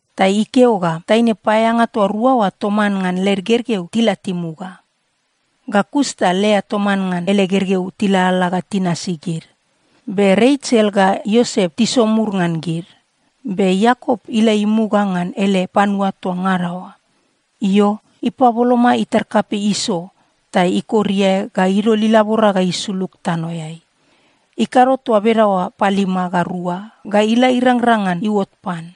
Ta ikeo ga taine paeaeanga toa rua oa toman ngan led gergeu tila timuga. Ga kus ta Lea toman ngan ele gergeu tilalala ga tinasi gid. Be Resel ga Iosep tisomur ngan gid. Be Iakop ila imuga ngan ele panua toa ngada oa. Io, ipaboloma itar kapei Iso ta ikor iae ga idol ilabora ga isulug tanoeai. Ikado toa bedaoa palima ga rua ga ila irangrang ngan iuot pan.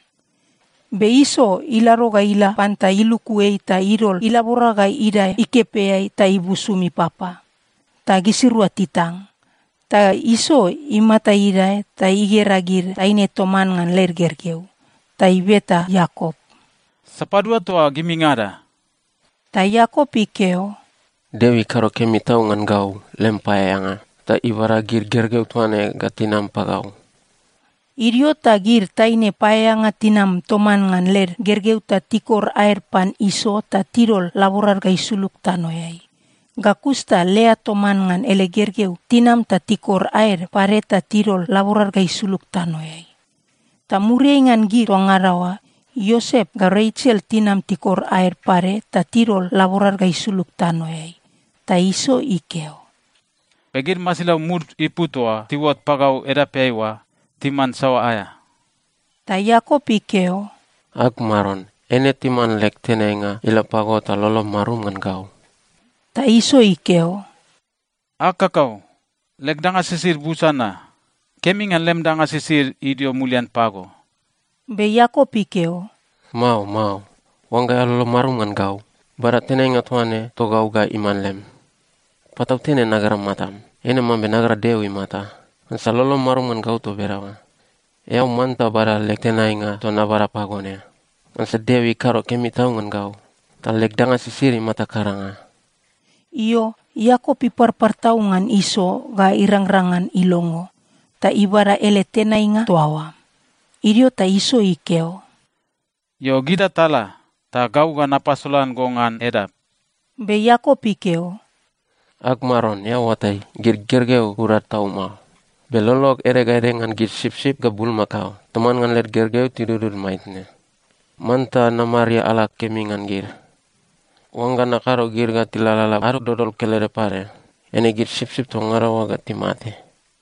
Be Iso ilado ga ila pan ta iluku ei ta idol ilabora ga idae ikepeai ta ibusum ipapa. Ta gisirua titang. Ta Iso imata idae ta igera gid taine toman ngan led gergeu. Ta ibeta Iakop, “Sapadua toa gimingada?” Ta Iakop ikeo, “Deo ikado kemi tau ngan gau, lem paeaeanga, ta ibada gid gergeu toa ne ga tinam pagau.” Idio ta gid taine paeaeanga tinam toman ngan led gergeu ta tikor aed pan Iso ta tidol laborad ga isulug tanoeai. Ga kus ta Lea toman ngan ele gergeu tinam ta tikor aed pade ta tidol laborad ga isulug tanoeai. Ta muriai ngan gid toa ngada oa, Iosep ga Resel tinam tikor aed pade ta tidol laborad ga isulug tanoeai. Ta Iso ikeo, “Be gid masilau mud ipu toa tiuot pagau edapeai oa timan saoa aea?” Ta Iakop ikeo, “Ag maron, eine timan leg tenainga ila pago ta lolom marum ngan gau.” Ta Iso ikeo, “Ag kakau, leg danga sisid busa na. Kemi ngan lem danga sisid idio mulian pago.” Be Iakop ikeo, “Mao, mao. Oangga eao lolom marum ngan gau, bada tenainga toa ne togau ga iman lem. Patautene nagera matam, eine mambe nagera Deo imata, ngansa lolom marum ngan gau toa bedaoa. Eao manta bada leg tenainga toa nabada pago ne, ngansa Deo ikado kemi tau ngan gau, ta leg danga sisid imata karanga.” Io, Iakop iparpar tau ngan Iso ga irangrang ngan ilongo, ta ibada ele tenainga toa oa. Idio ta Iso ikeo, “Io, gita tala. Ta gau ga napasolan go ngan edap.” Be Iakop ikeo, “Ag maron, eao oatai, gid gergeu urad tau mao. Be lolog ede ga ede ngan gid sipsip ga bulmakao toman ngan led gergeu toa tidudud maitne. Manta namariala kemi ngan gid. Oangga nakado gid ga tilalala ado dodol kelede pade, eine gid sipsip toa ngada oa ga timate.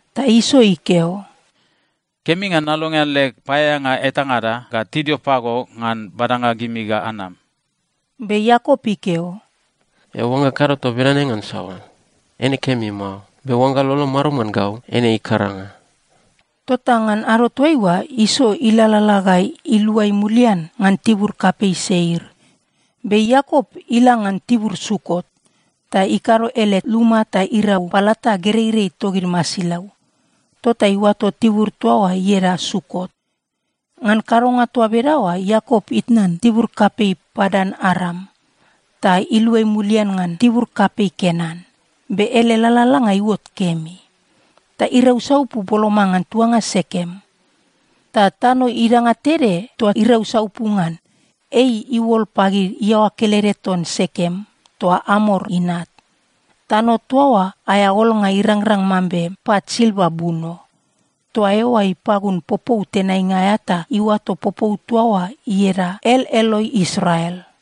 Ta Iso ikeo, “Kemi ngan nalongean leg paeaeanga etangada ga tidio pago ngan badanga gimi ga anam.” Be Iakop ikeo, “Eao oangga kado toa bedane ngan saoa? Eine kemi mao, be oangga lolom marum ngan gau, eine ikaranga.” Tota ngan ado toaiua, Iso ilalala ga iluai mulian ngan tibur kapei Seir. Be Iakop ila ngan tibur Sukot, ta ikado ele luma ta irau palata gereirei togid masilau. Tota iuato tibur toa oa ieda Sukot. Ngan kadonga toa bedaoa Iakop itnan tibur kapei Padan-Aram, ta iluai mulian ngan tibur kapei Kenan, be ele lalalanga iuot kemi. Ta irau saupu boloma ngan tuanga Sekem. Ta tano idanga tede toa irau saupu ngan, ei iuol pagid iaoa kelede ton Sekem toa Amor inat. Tano toa oa aea olnga irangrang mambe pat silva buno. Toa eoa ipagun popou tenainga aea ta iuato popou toa oa ieda El-Eloe-Israel.